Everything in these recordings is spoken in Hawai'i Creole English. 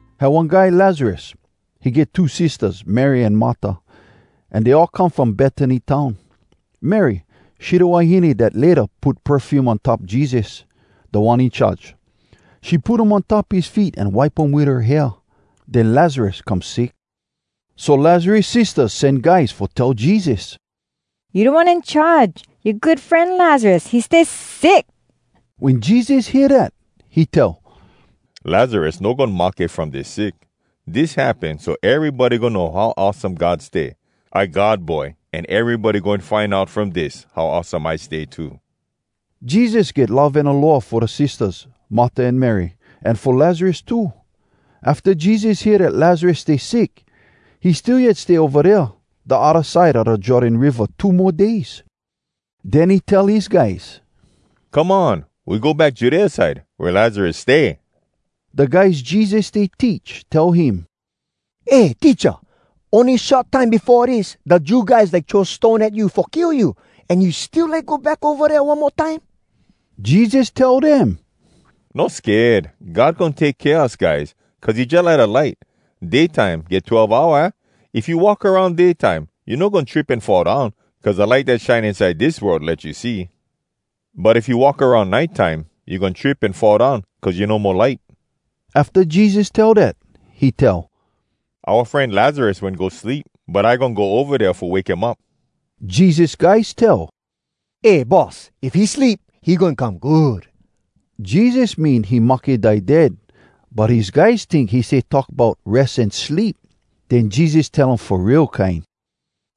Had one guy Lazarus. He get two sistahs, Mary an Marta, an dey all come from Betany town. Mary, she da wahine dat layta put perfume on top Jesus, Da One In Charge. She put um on top his feet an wipe um wit her hair. Den Lazarus come sick. So Lazarus sistahs sen guys fo tell Jesus, “You Da One In Charge, yoa good fren Lazarus, he stay sick.” Wen Jesus hear dat, he tell, “Lazarus no goin mahke from dis sick. Dis happen so erybody goin know how awesome God stay. I God Boy, an erybody goin find out from dis how awesome I stay too.” Jesus get love an aloha fo da sistahs, Marta an Mary, an fo Lazarus too. Afta Jesus hear dat Lazarus stay sick, he still yet stay ova dea da odda side a da Jordan Riva two mo days. Den he tell his guys, “Come on. We go back Judea side, wea Lazarus stay.” Da guys Jesus stay teach tell him, “Eh, Teacha, ony short time befo dis da Jew guys like throw stone at you fo kill you. An you still like go back ova dea one mo time?” Jesus tell dem, “No sked! God goin take kea us guys, cuz he jalike da light. Day time get twelve hour, aah? If you walk aroun day time, you no goin trip an fall down, cuz da light dat shine inside dis world let you see. But if you walk aroun nite time, you goin trip an fall down, cuz you no mo light.” Afta Jesus tell dat, he tell, “Oua fren Lazarus wen go sleep, but I goin go ova dea fo wake him up.” Jesus guys tell, “Eh Boss, if he sleep, he goin come good.” Jesus mean he mahke die dead, but his guys tink he stay talk bout res an sleep. Den Jesus tell um fo real kine,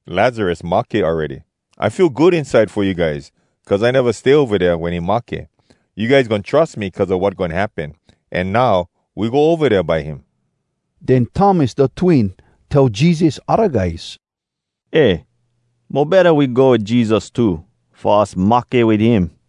“Lazarus mahke awready. I feel good inside fo you guys, cuz I neva stay ova dea wen he mahke. You guys goin trus me cuz a wat goin happen. An now, we go ova dea by him.” Den Thomas da Twin tell Jesus odda guys, “Eh, mo betta we go wit Jesus too, fo us mahke wit him.”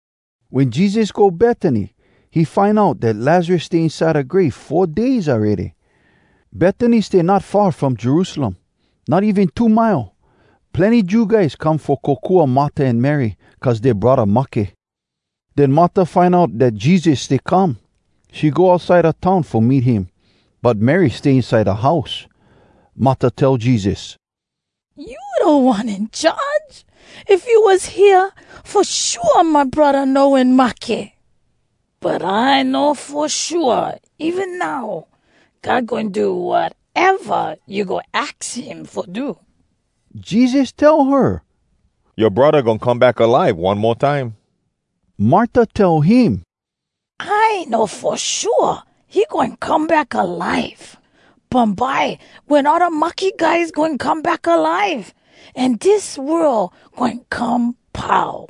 Wen Jesus go Betany, he find out dat Lazarus stay inside da grave four days awready. Betany stay not far from Jerusalem, not even two mile. Plenny Jew guys come fo kokua Marta an Mary, cuz dea braddah mahke. Den Marta find out dat Jesus stay come. She go outside da town fo meet him. But Mary stay inside da house. Marta tell Jesus, “You Da One In Charge! If you was hea, fo shua my braddah no wen mahke! But I know fo shua even now, God goin do wateva you go aks him fo do.” Jesus tell her, “Yoa braddah goin come back alive one mo time.” Marta tell him, “I know fo shua he goin come back alive, bumbye wen all da mahke guys goin come back alive, an dis world goin come pau.”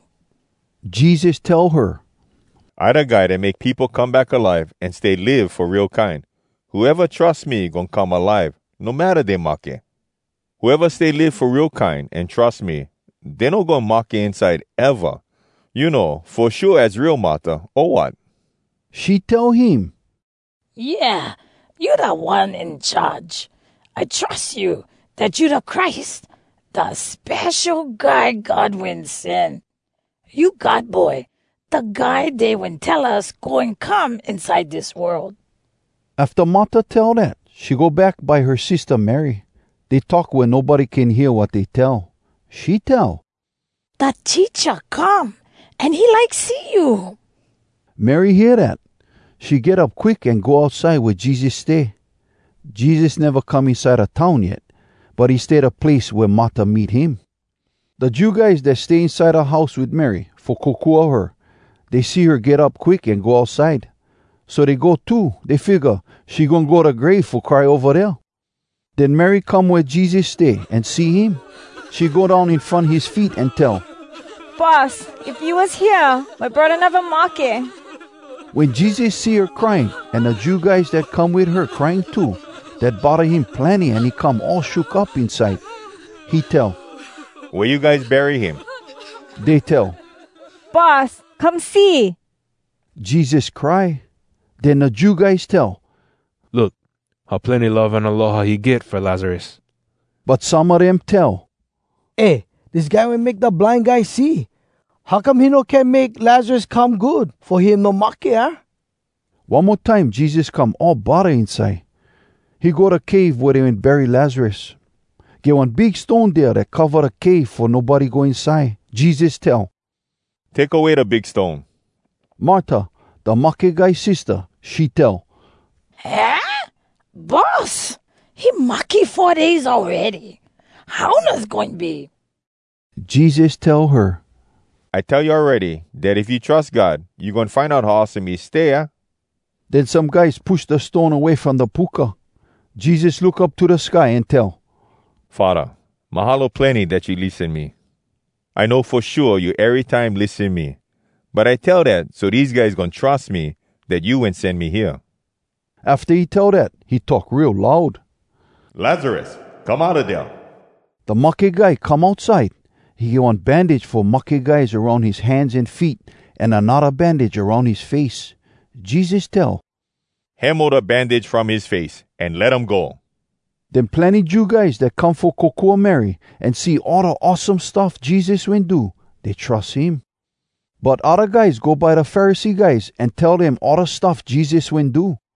Jesus tell her, “I da Guy dat make peopo come back alive an stay live fo real kine. Whoeva trus me goin come alive, no matta dey mahke. Whoeva stay live fo real kine an trus me, dey no goin mahke inside, eva! You know fo shua az real, Marta, o wat?” She tell him, “Yeah, you Da One In Charge! I trus you, dat you da Christ, da Spesho Guy God Wen Sen. You God Boy, da Guy dey wen tell us goin come inside dis world.” Afta Marta tell dat, she go back by her sistah Mary. Dey talk wea nobody can hear wat dey tell. She tell, “Da Teacha come, an he like see you.” Mary hear dat. She get up quick an go outside wea Jesus stay. Jesus neva come inside da town yet, but he stay da place wea Marta meet him. Da Jew guys dat stay inside da house wit Mary, fo kokua her, dey see her get up quick an go outside. So dey go too. Dey figga she goin go da grave fo cry ova dea. Den Mary come wea Jesus stay, an see him. She go down in front his feets an tell, “Boss, if you was hea, my braddah neva mahke.” Wen Jesus see her crying, an da Jew guys dat come wit her crying too, dat bodda him plenny an he come all shook up inside. He tell, “Wea you guys bury him?” Dey tell, “Boss, come see.” Jesus cry. Den da Jew guys tell, “Look, how plenny love an aloha he get fo Lazarus!” But some a dem tell, “Eh! Dis guy wen make da blind guys see. How come he no can make Lazarus come good fo him no mahke, aah?” One mo time Jesus come all bodda inside. He go da cave wea dey wen bury Lazarus. Get one big stone dea dat cova da cave fo nobody go inside. Jesus tell, “Take away da big stone.” Marta, da mahke guy sistah, she tell, “Haah, Boss? He mahke four days awready! Haunas goin be!” Jesus tell her, “I tell you awready dat if you trus God, you goin find out how awesome he stay, aah?” Den some guys push da stone away from da puka. Jesus look up to da sky an tell, “Faddah, mahalo plenny dat you lissen me. I know fo shua you erytime lissen me. But I tell dat so dese guys goin trus me, dat you wen sen me hea.” Afta he tell dat, he talk real loud, “Lazarus, come outa dea!” Da mahke guy come outside. He get one bandage fo mahke guys aroun his hands an feet, an anodda bandage aroun his face. Jesus tell, “Hemo da bandage from his face, an let him go.” Den plenny Jew guys dat come fo kokua Mary, an see all da awesome stuff Jesus wen do, dey trus him. But odda guys go by da Pharisee guys, an tell dem all da stuff Jesus wen do.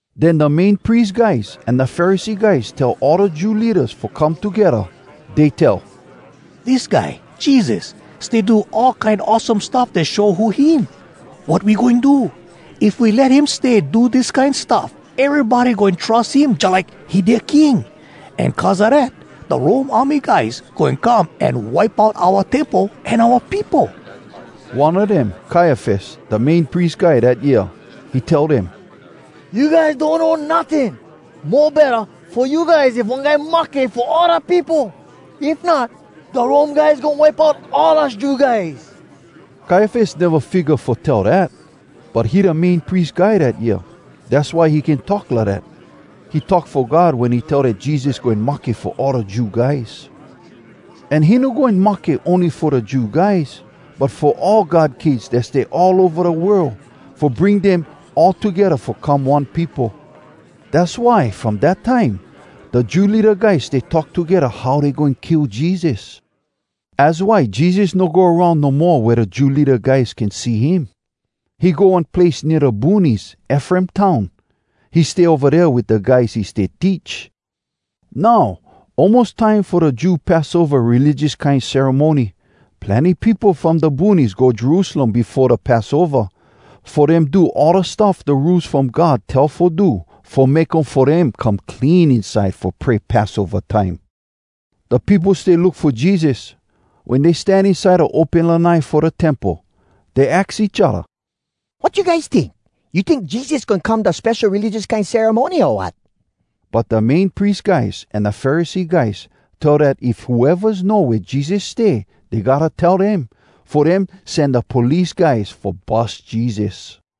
Den da Main Pries guys an da Pharisee guys tell all da Jew leadas fo come togedda. Dey tell, “Dis guy Jesus stay do all kine awesome stuff dat show who him! Wat we goin do? If we let him stay do dis kine stuff, erybody goin go trus him jalike he dea king! An cuz a dat, da Rome army guys goin come an wipe out oua Temple an oua peopo.” One a dem, Kaiafas, da Main Pries Guy dat year. He tell dem, “You guys donno notting! Mo betta fo you guys if one guy mahke fo all da peopo. If not, da Rome guys goin wipe out all us Jew guys!” Kaiafas neva figga fo tell dat, but he da Main Pries Guy dat year, dass why he can talk lidat. He talk fo God wen he tell dat Jesus goin mahke fo all da Jew guys. An he no goin mahke ony fo da Jew guys, but fo all God kids dat stay all ova da world, fo bring dem all togedda fo come one peopo. Dass why, from dat time, da Jew leada guys stay talk togedda how dey goin kill Jesus. Az why Jesus no go aroun no mo wea da Jew leada guys can see him. He go one place nea da boonies, Efraim town. He stay ova dea wit da guys he stay teach. Now, almos time fo da Jew Passova religious kine ceremony. Plenny peopo from da boonies go Jerusalem befo da Passova, fo dem do all da stuff da Rules From God tell fo do fo make um fo dem come clean inside fo pray Passova time. Da peopo stay look fo Jesus. Wen dey stan inside da open lanai fo da Temple, dey aks each odda, “Wat you guys tink? You tink Jesus goin come da spesho religious kine ceremony, o wat?” But da Main Pries guys an da Pharisee guys tell dat if whoevas know wea Jesus stay, dey gotta tell dem, fo dem sen da police guys fo bus Jesus.